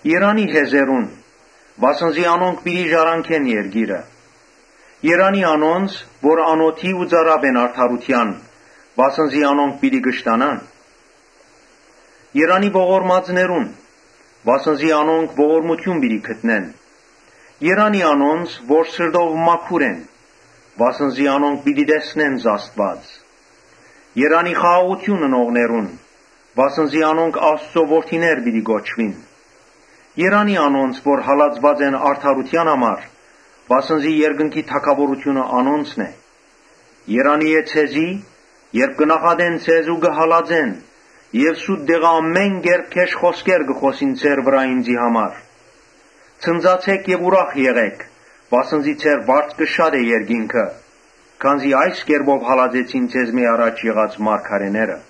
Երանի՜ հեզերուն, վասն զի անոնք պիտի ժառանգեն երկիրը։ Երանի՜ անոնց որ անօթի ու ծարաւ են արդարութեան, վասն զի անոնք պիտի կշտանան։ Երանի՜ ողորմածներուն, վասն զի անոնք ողորմութիւն պիտի գտնեն։ Երանի՜ անոնց որ սրտով մաքուր են, վասն զի անոնք պիտի տեսնեն Աստուած։ Երանի՜ խաղաղութիւն ընողներուն, վասն զի անոնք Աստուծոյ որդիներ պիտի կոչուին։ Երանի՜ անոնց որ հալածուած են արդարութեան համար, վասն զի երկնքի թագաւորութիւնը անոնցն է։ Երանի՜ է ձեզի, երբ կը նախատեն ձեզ ու կը հալածեն եւ սուտ տեղը ամէն կերպ գէշ խօսքեր կը խօսին ձեր վրայ ինծի համար։ Ցնծացէք եւ ուրախ եղէք, վասն զի ձեր վարձքը շատ է երկինքը. քանզի այս կերպով հալածեցին ձեզմէ առաջ եղած մարգարէները»։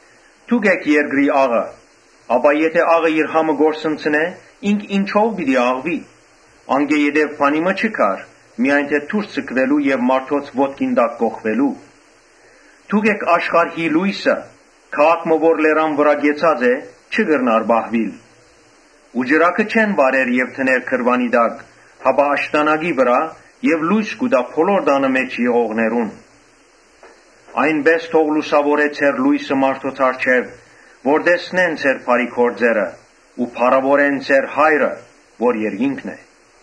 «Դուք էք երկրի աղը։ Եթէ աղը իր համը կորսնցնէ, ինք ինչո՞վ պիտի աղուի։ Անկէ յետոյ բանի մը չի գար, միայն թէ դուրս ձգուելու եւ մարդոց ոտքով կոխկռտուելու։ Դուք էք աշխարհի լոյսը. քաղաք մը որ լերան վրայ կեցած է, չի կրնար պահուիլ։ Ու ճրագը չեն վառեր եւ դներ գրուանի տակ, հապա աշտանակի վրայ որ լոյս տայ բոլոր տանը մէջ եղողներուն։ Այնպէս թող լուսաւորուի ձեր լոյսը մարդոց առջեւ, որ տեսնեն ձեր բարի գործերը ու փառաւորեն ձեր Հայրը որ երկինքն է»։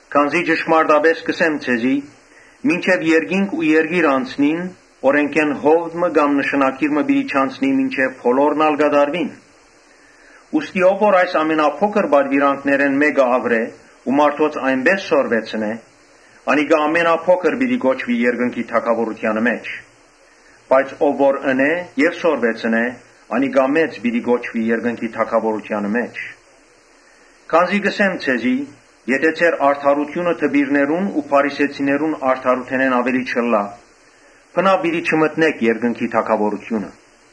Քանզի ճշմարտապէս կ’ըսեմ ձեզի, ‘Մինչեւ երկինք ու երկիր անցնին, օրէնքէն յովտ մը կամ նշանագիր մը պիտի չանցնի, մինչեւ բոլորն ալ կատարուին’։ Ուստի ով որ այս ամենափոքր պատուիրանքներէն մէկը աւրէ ու մարդոց այնպէս սորվեցնէ, անիկա ամենափոքր պիտի կոչուի երկնքի թագաւորութեանը մէջ. բայց ով որ ընէ եւ սորվեցնէ, անիկա մեծ պիտի կոչուի երկնքի թագաւորութեանը մէջ։ Քանզի կ’ըսեմ ձեզի, Եթէ ձեր արդարութիւնը դպիրներուն ու փարիսեցիներուն արդարութենէն աւելի չըլլայ, բնաւ պիտի չմտնէք երկնքի թագաւորութիւնը»։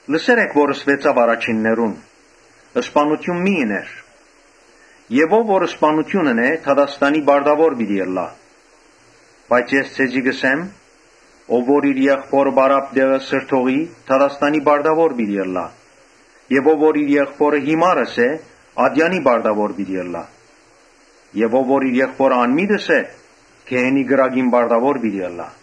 «Լսեր էք որ ըսուեցաւ առաջիններուն, ‘Սպաննութիւն մի՛ ըներ’։ Ով որ սպաննութիւն ընէ, դատաստանի պարտաւոր պիտի ըլլայ»։ Բայց ես ձեզի կ’ըսեմ. «Ով որ իր եղբօրը պարապ տեղը սրդողի, դատաստանի պարտաւոր պիտի ըլլայ։ Ով որ իր եղբօրը Յիմար ըսէ, ատեանին պարտաւոր պիտի ըլլայ։ Ով որ իր եղբօրը Անմիտ ըսէ, գեհենի կրակին պարտաւոր պիտի ըլլայ։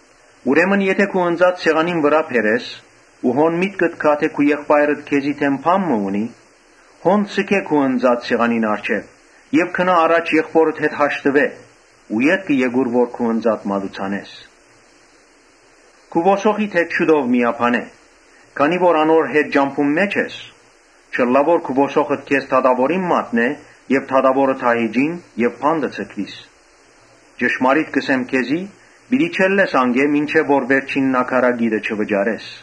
Ուրեմն եթէ քու ընծադ սեղանին վրայ բերես ու հոն միտքդ գայ թէ քու եղբայրդ քեզի դէմ բան մը ունի, Հոն ձգէ ընծադ սեղանին առջեւ, գնա առաջ եղբօրդ հետ հաշտուէ ու ետքը եկուր որ քու ընծադ մատուցանես։ Քու ոսոխիդ հետ շուտով միաբանէ, քանի որ անոր հետ ճամբուն մէջ ես։ Չըլլայ թէ քու ոսոխդ քեզ դատաւորին մատնէ եւ դատաւորը դահիճին եւ բանտը ձգուիս։ Ճշմարիտ կ’ըսեմ քեզի, ‘Պիտի չելլես անկէ՝ մինչեւ որ վերջին նաքարակիտը չվճարես’»։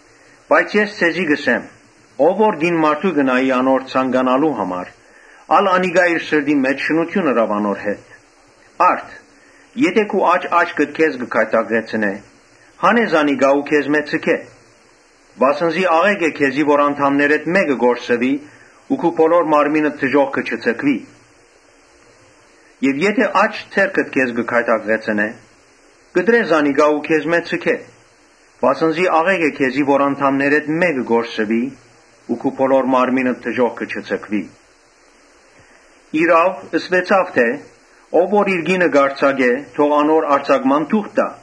Բայց ես ձեզի կ’ըսեմ. ‘Ով որ կին մարդու կը նայի անոր ցանկալու համար, ալ անիկա իր սրտին մէջ շնութիւն ըրաւ անոր հետ’։ Արդ եթէ քու աջ աչքդ քեզ կը գայթակղեցնէ, հանէ զանիկա ու քեզմէ ձգէ. վասն զի աղէկ է քեզի որ անդամներէդ մէկը կորսուի, բայց քու բոլոր մարմինդ դժոխքը չձգուի։ Եթէ աջ ձեռքդ քեզ կը գայթակղեցնէ, կտրէ զանիկա ու քեզմէ ձգէ. վասն զի աղէկ է քեզի որ անդամներէդ մէկը կորսուի ու քու բոլոր մարմինդ դժոխքը չձգուի։ Իրաւ, ըսուեցաւ թէ ‘Ով որ իր կինը կ’արձակէ, թող անոր արձակման թուղթ տայ’.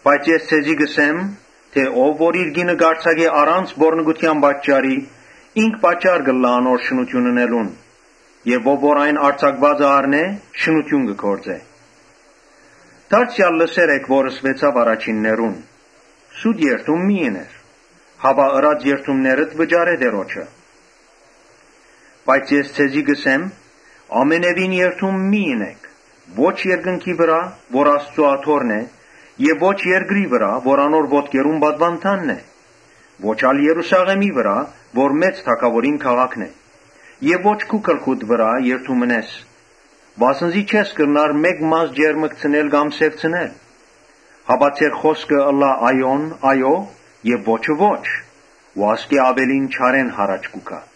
Բայց ես ձեզի կ’ըսեմ. ‘Ով որ իր կինը արձակէ, առանց պոռնկութեան պատճառի, ինք պատճառ կ’ըլլայ անոր շնութիւն ընելուն եւ ով որ այն արձակուածը առնէ, շնութիւն կը գործէ’։ Դարձեալ լսեր էք որ ըսուեցաւ առաջիններուն, «Սուտ երդում մի՛ ըներ, հապա ըրած երդումներդ վճարէ Տէրոջը»։ Բայց ես ձեզի կ’ըսեմ. «Ամենեւին երդում մի՛ ընէք, ո՛չ երկնքի վրայ՝ որ Աստուծոյ աթոռն է Եւ ո՛չ ալ երկրի վրայ՝ որ անոր ոտքերուն պատուանդանն է, ո՛չ ալ Երուսաղէմի վրայ՝ որ մեծ Թագաւորին քաղաքն է, Ոչ ալ քու գլխուդ վրայ երդում ընես, վասն զի չես կրնար մէկ մազ ճերմկցնել կամ սեւցնել։ Հապա ձեր խօսքը ըլլայ այոն՝ այո, եւ ոչը՝ ոչ. ու ասկէ աւելին չարէն յառաջ կու գայ»։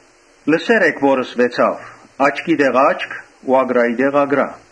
Լսեր էք որ ըսուեցաւ. «Աչքի տեղ՝ աչք ու ակռայի տեղ՝ ակռայ»։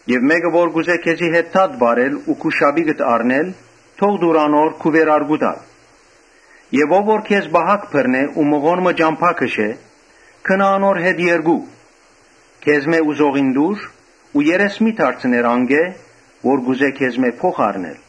Եթէ մէկը ուզէ քեզի հետ դատ վարել ու քու շապիկդ առնել, թող տուր անոր քու վերարկուդ ալ։ Եւ ով որ քեզ պահակ բռնէ ու մղոն մը ճամբայ քշէ, գնա անոր հետ երկու։ Քեզմէ ուզողին տուր ու երես մի՛ դարձներ անկէ՝ որ կ’ուզէ քեզմէ փոխ առնել»։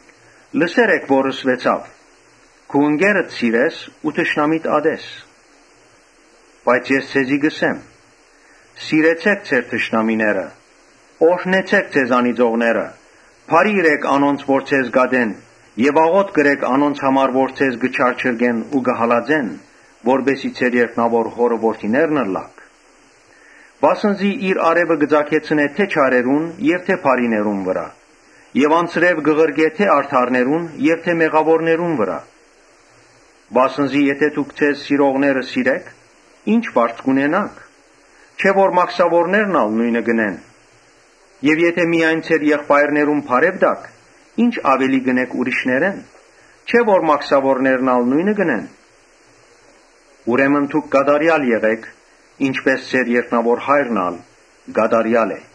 Լսեր էք որ ըսուեցաւ. «Քու ընկերդ սիրես ու թշնամիդ ատես»։ Բայց ես ձեզի կ’ըսեմ. «Սիրեցէք ձեր թշնամիները, օրհնեցէք ձեզ անիծողները, բարիք ըրէք անոնց որ ձեզ կ’ատեն եւ աղօթք ըրէք անոնց համար որ ձեզ կը չարչարեն ու կը հալածեն. Որպէս զի ձեր երկնաւոր Հօրը որդիներն ըլլաք. վասն զի իր արեւը կը ծագեցնէ թէ՛ չարերուն եւ թէ՛ բարիներուն վրայ եւ անձրեւ կը ղրկէ թէ՛ արդարներուն եւ թէ՛ մեղաւորներուն վրայ։ Վասն զի եթէ դուք ձեզ սիրողները սիրէք, ի՞նչ առաւելութիւն կ’ունենաք. չէ՞ որ մաքսաւորներն ալ նոյնը կ’ընեն։ Եւ եթէ միայն ձեր եղբայրներուն բարեւ տաք, ի՞նչ աւելի կ’ընէք ուրիշներէն. չէ՞ որ մաքսաւորներն ալ նոյնը կ’ընեն։ Ուրեմն դուք կատարեալ եղէք, ինչպէս ձեր երկնաւոր Հայրն ալ կատարեալ է»։